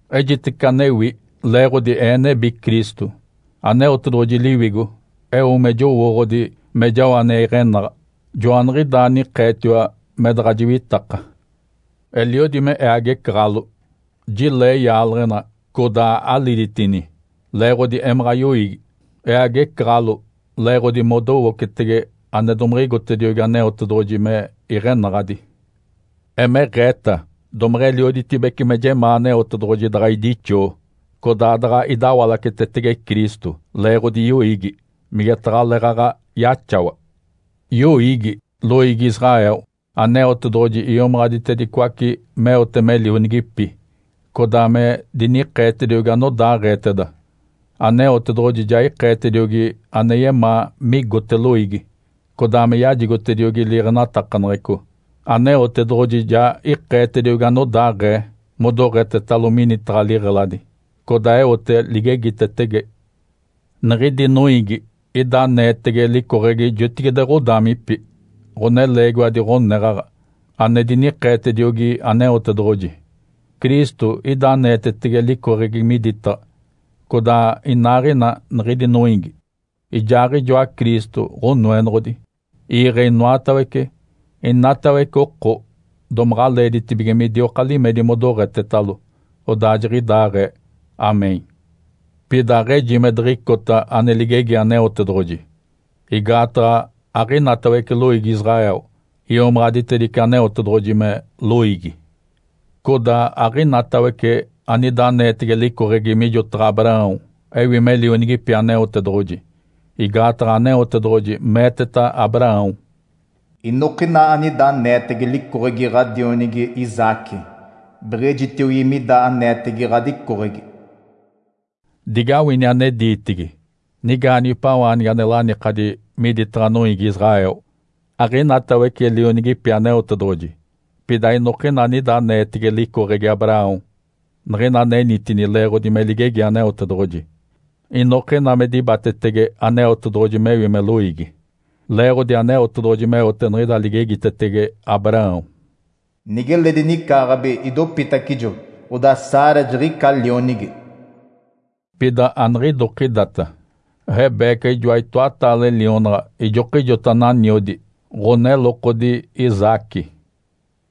Ejitece anewi leeɡ̶odi ee nebi Cristo. Aneotedoɡ̶oji Liwigo eo me jowooɡ̶odi me jao ane iɡ̶enaɡ̶a. Joaniɡ̶idaa nikeetiwa me daɡ̶a jiwitaka. Eliodi me ee agecaɡ̶alo, jilee yaaleɡ̶ena codaa aliditini, leeɡ̶odi emaɡ̶a yoiigi. (Ee agecaɡ̶alo leeɡ̶odi modowocetege ane domiɡ̶igotediogi Aneotedoɡ̶oji me iɡ̶enaɡ̶adi). Emeɡ̶eeta domeɡ̶elioditibece me jemaa Aneotedoɡ̶oji daɡ̶a idixoo, codaa daɡ̶a idawalacetetege Cristo leeɡ̶odi yoiigi, migetaɡ̶aleeɡ̶aɡ̶a yaxawa. Yoiigi, loiigi Israel. Aneotedoɡ̶oji iomaɡ̶aditedicoace meote me lionigipi, codaa me dinikeetediogi anodaaɡ̶eeteda. Aneotedoɡ̶oji ja ikeetediogi ane yemaa migote loiigi, codaa me yajigotediogi liiɡ̶enatakaneɡ̶eco. Aneotedoɡ̶oji ja ikeetediogi anodaaɡ̶ee modoɡ̶etetalo minitaɡ̶a liɡ̶eladi, codaa eote ligegitetege. Niɡ̶idi noiigi ida aneetege licoɡ̶egi jotigide ɡ̶odaamipi, ɡ̶oneleegiwadi ɡ̶oneɡ̶aɡ̶a, ane dinikeetediogi Aneotedoɡ̶oji. Cristo ida aneetetege licoɡ̶egi miditaɡ̶a, codaa inaaɡ̶ina niɡ̶idi noiigi. Ijaaɡ̶ijoa Cristo Ǥonoenoɡ̶odi, iiɡ̶e inoatawece. Inatawece oko domaɡ̶a leeditibige midioka limedi modoɡ̶etetalo. Odaa jiɡ̶idaaɡ̶ee. (Amém.) Pida aɡ̶eji me diɡ̶icota ane ligegi Aneotedoɡ̶oji. Igaataɡ̶a aɡ̶inatawece loiigi Israel iomaɡ̶aditedice Aneotedoɡ̶oji me loiigi. Codaa aɡ̶inatawece anida aneetege licoɡ̶egi mijotaɡ̶a Abraão ewi me lionigipi Aneotedoɡ̶oji. Igaataɡ̶a Aneotedoɡ̶oji meeteta Abraão, “Inokina anida aneetege licoɡ̶egi ɡ̶adionigi Isaque, beɡ̶ejitiogi mida aneetege ɡ̶adicoɡ̶egi.” Digawini ane diitigi, nigaanigipawaanigi ane lanikadi miditaɡ̶a noiigi Israel, aɡ̶inatawece lionigipi Aneotedoɡ̶oji. Pida inokina mida aneetege licoɡ̶egi Abraão niɡ̶ina anenitini leeɡ̶odi me ligegi Aneotedoɡ̶oji, inokina me dibatetege Aneotedoɡ̶oji mewi me loiigi. Leeɡ̶odi Aneotedoɡ̶oji meote niɡ̶ida ligegitetege Abraão, “Nigeledi nicaaɡ̶abi, idopitacijo, odaa Sara jiɡ̶icaa lionigi.” Pida aniɡ̶idokidata. Rebeca ijoa itoataale lionaɡ̶a ijokijota naniodi, ɡ̶onelokodi Isaque.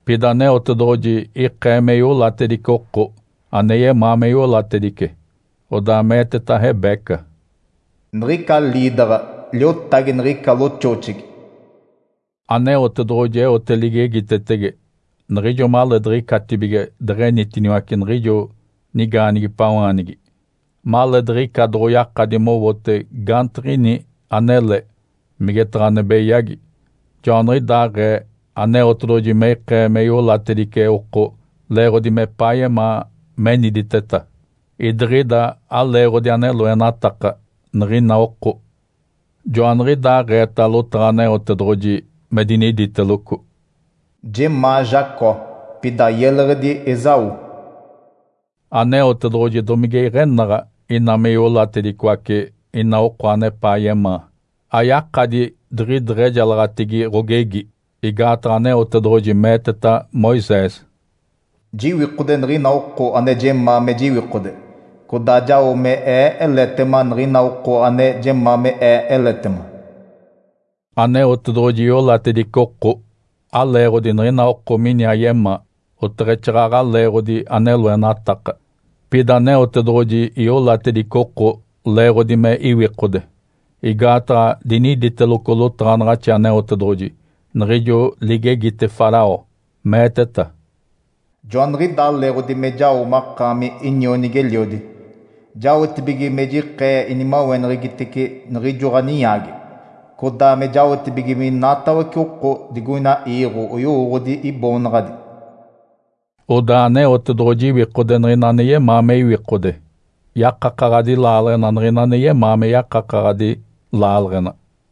Pida Aneotedoɡ̶oji ikee me iolatedice oko ane yemaa me iolatedice, odaa meeteta Rebeca, “Niɡ̶ica liidaɡ̶a, liotagi niɡ̶ica loxooxegi.” Aneotedoɡ̶oji eote ligegitetege niɡ̶ijo maleediɡ̶icatibige deɡ̶enitiniwace niɡ̶ijo nigaanigipawaanigi, maleediɡ̶ica doɡ̶oyakadi mowote gaantiɡ̶ini anele, migetaɡ̶a ane beyagi. Joaniɡ̶idaaɡ̶ee Aneotedoɡ̶oji me ikee me iolatedice oko leeɡ̶odi mepaa yemaa meniditeta, idiɡ̶ida aleeɡ̶odi ane loenataka niɡ̶ina oko. Joaniɡ̶idaaɡ̶eeta lotaɡ̶a Aneotedoɡ̶oji me diniditeloco, “Jemaa Jacó, pida yeleɡ̶edi Esaú.” Aneotedoɡ̶oji domige iɡ̶enaɡ̶a ina me iolatedicoace ina oko anepaa yemaa? Ayakadi diɡ̶ideɡ̶ejalaɡ̶atigi ɡ̶ogegi! Igaataɡ̶a Aneotedoɡ̶oji meeteta Moisés, “Jiwikode niɡ̶ina oko ane jemaa me jiwikode. Codaa jao me Ee eletema niɡ̶ina oko ane jemaa me Ee eletema.” Aneotedoɡ̶oji iolatedice oko aleeɡ̶odi niɡ̶ina oko miniaa yemaa, oteɡ̶exaaɡ̶aɡ̶a leeɡ̶odi ane loenataka. Pida Aneotedoɡ̶oji iolatedice oko leeɡ̶odi me iwikode. Igaataɡ̶a diniditeloco lotaɡ̶anaɡ̶axi Aneotedoɡ̶oji niɡ̶ijo ligegite Faraó, meeteta, “Joaniɡ̶idaa leeɡ̶odi me jao makaami inionigi-eliodi, jaotibige me jikee inimaweneɡ̶egitece niɡ̶ijo ɡ̶aninyaagi, codaa me jaotibige minatawece oko digoina iiɡ̶o oyowooɡ̶odi Iboonaɡ̶adi.” Odaa Aneotedoɡ̶oji iwikode niɡ̶ina ane yemaa me iwikode, yakakaɡ̶adi laaleɡ̶ena niɡ̶ina ane yemaa me yakakaɡ̶adi laaleɡ̶ena.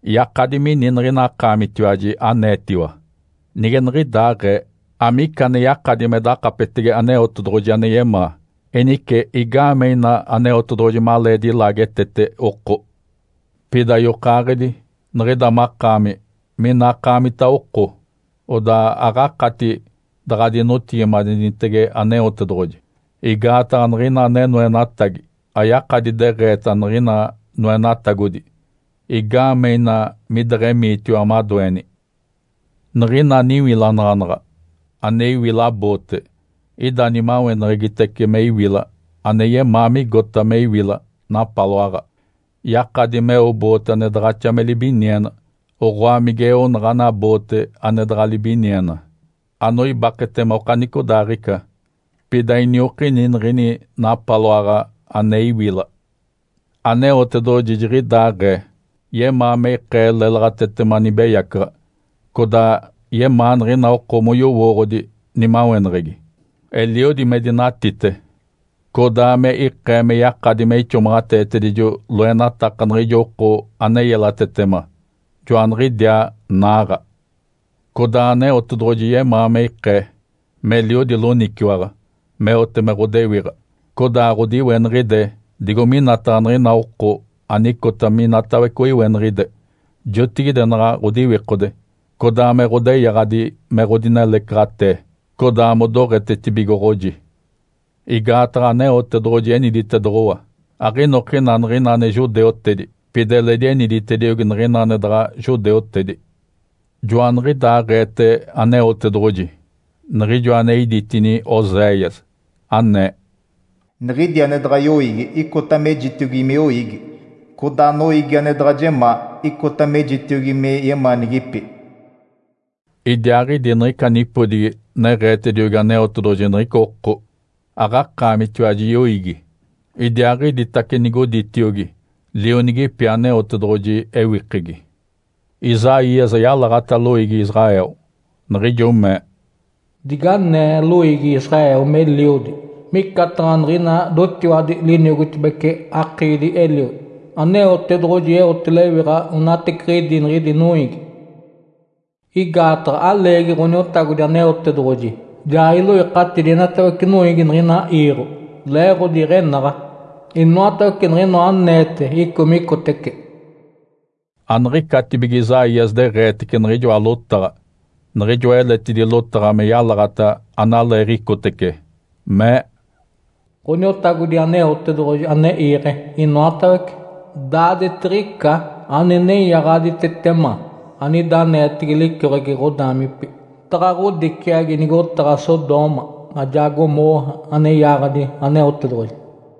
Yakadi mini niɡ̶ina akaamitiwaji aneetiwa, “Nige niɡ̶idaaɡ̶ee, amica ane yakadi me dakapetege Aneotedoɡ̶oji ane yemaa, enice igaamee ina Aneotedoɡ̶oji malee dilaagetete oko?” Pida yokaaɡ̶edi. Niɡ̶ida makaami minakaamita oko. Odaa aɡ̶akati daɡ̶adinotigimadenitege Aneotedoɡ̶oji. Igaataɡ̶a niɡ̶ina ane noenatagi ayakadi deɡ̶eeta niɡ̶ina noenatagodi, “Igaamee ina mideɡ̶emiitiwa madoeni?” Niɡ̶ina niwilanaɡ̶anaɡ̶a ane iwila boote ida nimaweneɡ̶egitece me iwila ane yemaa migota me iwila napaloaɡ̶a. Yakadi meo boote ane daɡ̶axa me libiniena, oɡ̶oa migeo naɡ̶ana boote ane daɡ̶a libiniena anoibaketema okanicodaaɡ̶ica. Pida iniokini niɡ̶ini napaloaɡ̶a ane iwila. Aneotedoɡ̶oji jiɡ̶idaaɡ̶ee. Yemaa me ikee lélaɡ̶atetema nibeyacaɡ̶a, codaa yemaa niɡ̶ina oko moyowooɡ̶odi nimaweneɡ̶egi. Eliodi me dinatite, codaa me ikee me yakadi me ixomaɡ̶ateetedijo loenataka niɡ̶ijo oko ane yelatetema, joaniɡ̶idiaa naaɡ̶a. Codaa Aneotedoɡ̶oji yemaa me ikee meliodi loniciwaɡ̶a meote me ɡ̶odewiɡ̶a codaa ɡ̶odiweniɡ̶ide digo minataɡ̶a niɡ̶ina oko anicota minatawece oiweniɡ̶ide. Jotigide naɡ̶a ɡ̶odiwikode, codaa me ɡ̶odeyaɡ̶adi me ɡ̶odinelecaɡ̶atee, codaa modoɡ̶etetibigoɡ̶oji. Igaataɡ̶a Aneotedoɡ̶oji eniditedoɡ̶owa, aɡ̶inokina niɡ̶ina ane judeutedi, pida eledi eniditediogi niɡ̶ina ane daɡ̶a judeutedi. Joaniɡ̶idaaɡ̶eete Aneotedoɡ̶oji, niɡ̶ijo ane iditini Oséias, anee, “Niɡ̶idi ane daɡ̶a yoiigi, icota mejitiogi me, ‘Yoiigi’. Codaa noiigi ane daɡ̶a jemaa, icota mejitiogi me, ‘Yemaanigipi.’” Idiaaɡ̶idi niɡ̶ica nipodigi neɡ̶eetediogi Aneotedoɡ̶oji niɡ̶ica oko, “Aɡ̶akaamitiwaji yoiigi”, idiaaɡ̶itace nigoditiogi, “Lionigipi Aneotedoɡ̶oji ewikegi.” Isaías yalaɡ̶ata loiigi Israel, niɡ̶ijo mee, “Diganee loiigi Israel meliodi, micataɡ̶a niɡ̶ina dotiwadi liniogotibece akiidi-eliodi. Aneotedoɡ̶oji eote lewiɡ̶a onateciɡ̶idi niɡ̶idi noiigi. Igaataɡ̶a aleegi Ǥoniotagodi Aneotedoɡ̶oji ja iloikatidi inatawece noiigi niɡ̶ina iiɡ̶o, leeɡ̶odi iɡ̶enaɡ̶a. Inoatawece niɡ̶inoa aneete ico micotece.” Aniɡ̶icatibige Isaías deɡ̶eetece niɡ̶ijoa lotaɡ̶a, niɡ̶ijoa eletidi lotaɡ̶a me yalaɡ̶ata analeeɡ̶icotece, mee, “Ǥoniotagodi Aneotedoɡ̶oji ane iiɡ̶e inoatawece, daaditiɡ̶ica ane nenyaɡ̶aditetema anida aneetege licoɡ̶egi ɡ̶odaamipi, taɡ̶a ɡ̶odiciagi nigotaɡ̶a Sodoma ajaa Gomorra ane yaaɡ̶adi Aneotedoɡ̶oji.”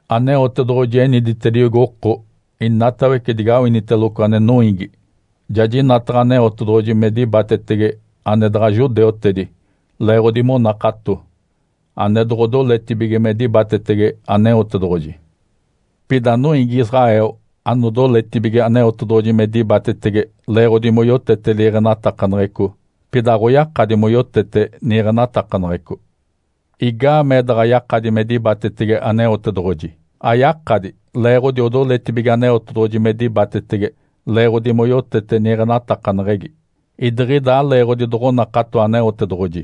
Aneotedoɡ̶oji eniditediogi oko inatawece digawiniteloco ane noiigi. Ja jinataɡ̶a Aneotedoɡ̶oji me dibatetege ane daɡ̶a judeutedi leeɡ̶odi monakato, ane doɡ̶odoletibige me dibatetege Aneotedoɡ̶oji. Pida noiigi Israel anodoletibige Aneotedoɡ̶oji me dibatetege leeɡ̶odi moyotete liiɡ̶enatakaneɡ̶eco, pida aɡ̶oyakadi moyotete niiɡ̶enatakaneɡ̶eco. Igaamee daɡ̶a yakadi me dibatetege Aneotedoɡ̶oji? Ayakadi leeɡ̶odi odoletibige Aneotedoɡ̶oji me dibatetege leeɡ̶odi moyotete niiɡ̶enatakaneɡ̶egi, idiɡ̶ida aleeɡ̶odi doɡ̶onakato Aneotedoɡ̶oji.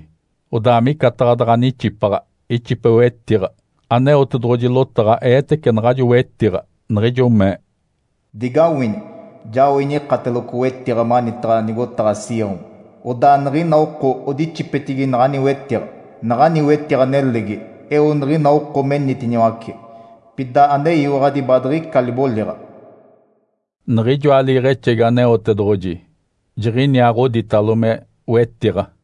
Odaa micataɡ̶a daɡ̶a nixipaɡ̶a, ixipe wetiɡ̶a. Aneotedoɡ̶oji lotaɡ̶a eetece naɡ̶ajo wetiɡ̶a, niɡ̶ijo mee, “Digawini! Jao inikateloco wetiɡ̶a manitaɡ̶a nigotaɡ̶a Sião. Odaa niɡ̶ina oko odixipetigi naɡ̶ani wetiɡ̶a. Naɡ̶ani wetiɡ̶a nelegi eo niɡ̶ina oko menitiniwace. Pida aneyiwaɡ̶adi baadiɡ̶ica liboliɡ̶a.” (Niɡ̶ijoa liiɡ̶exegi Aneotedoɡ̶oji jiɡ̶iniaaɡ̶oditalo me wetiɡ̶a.)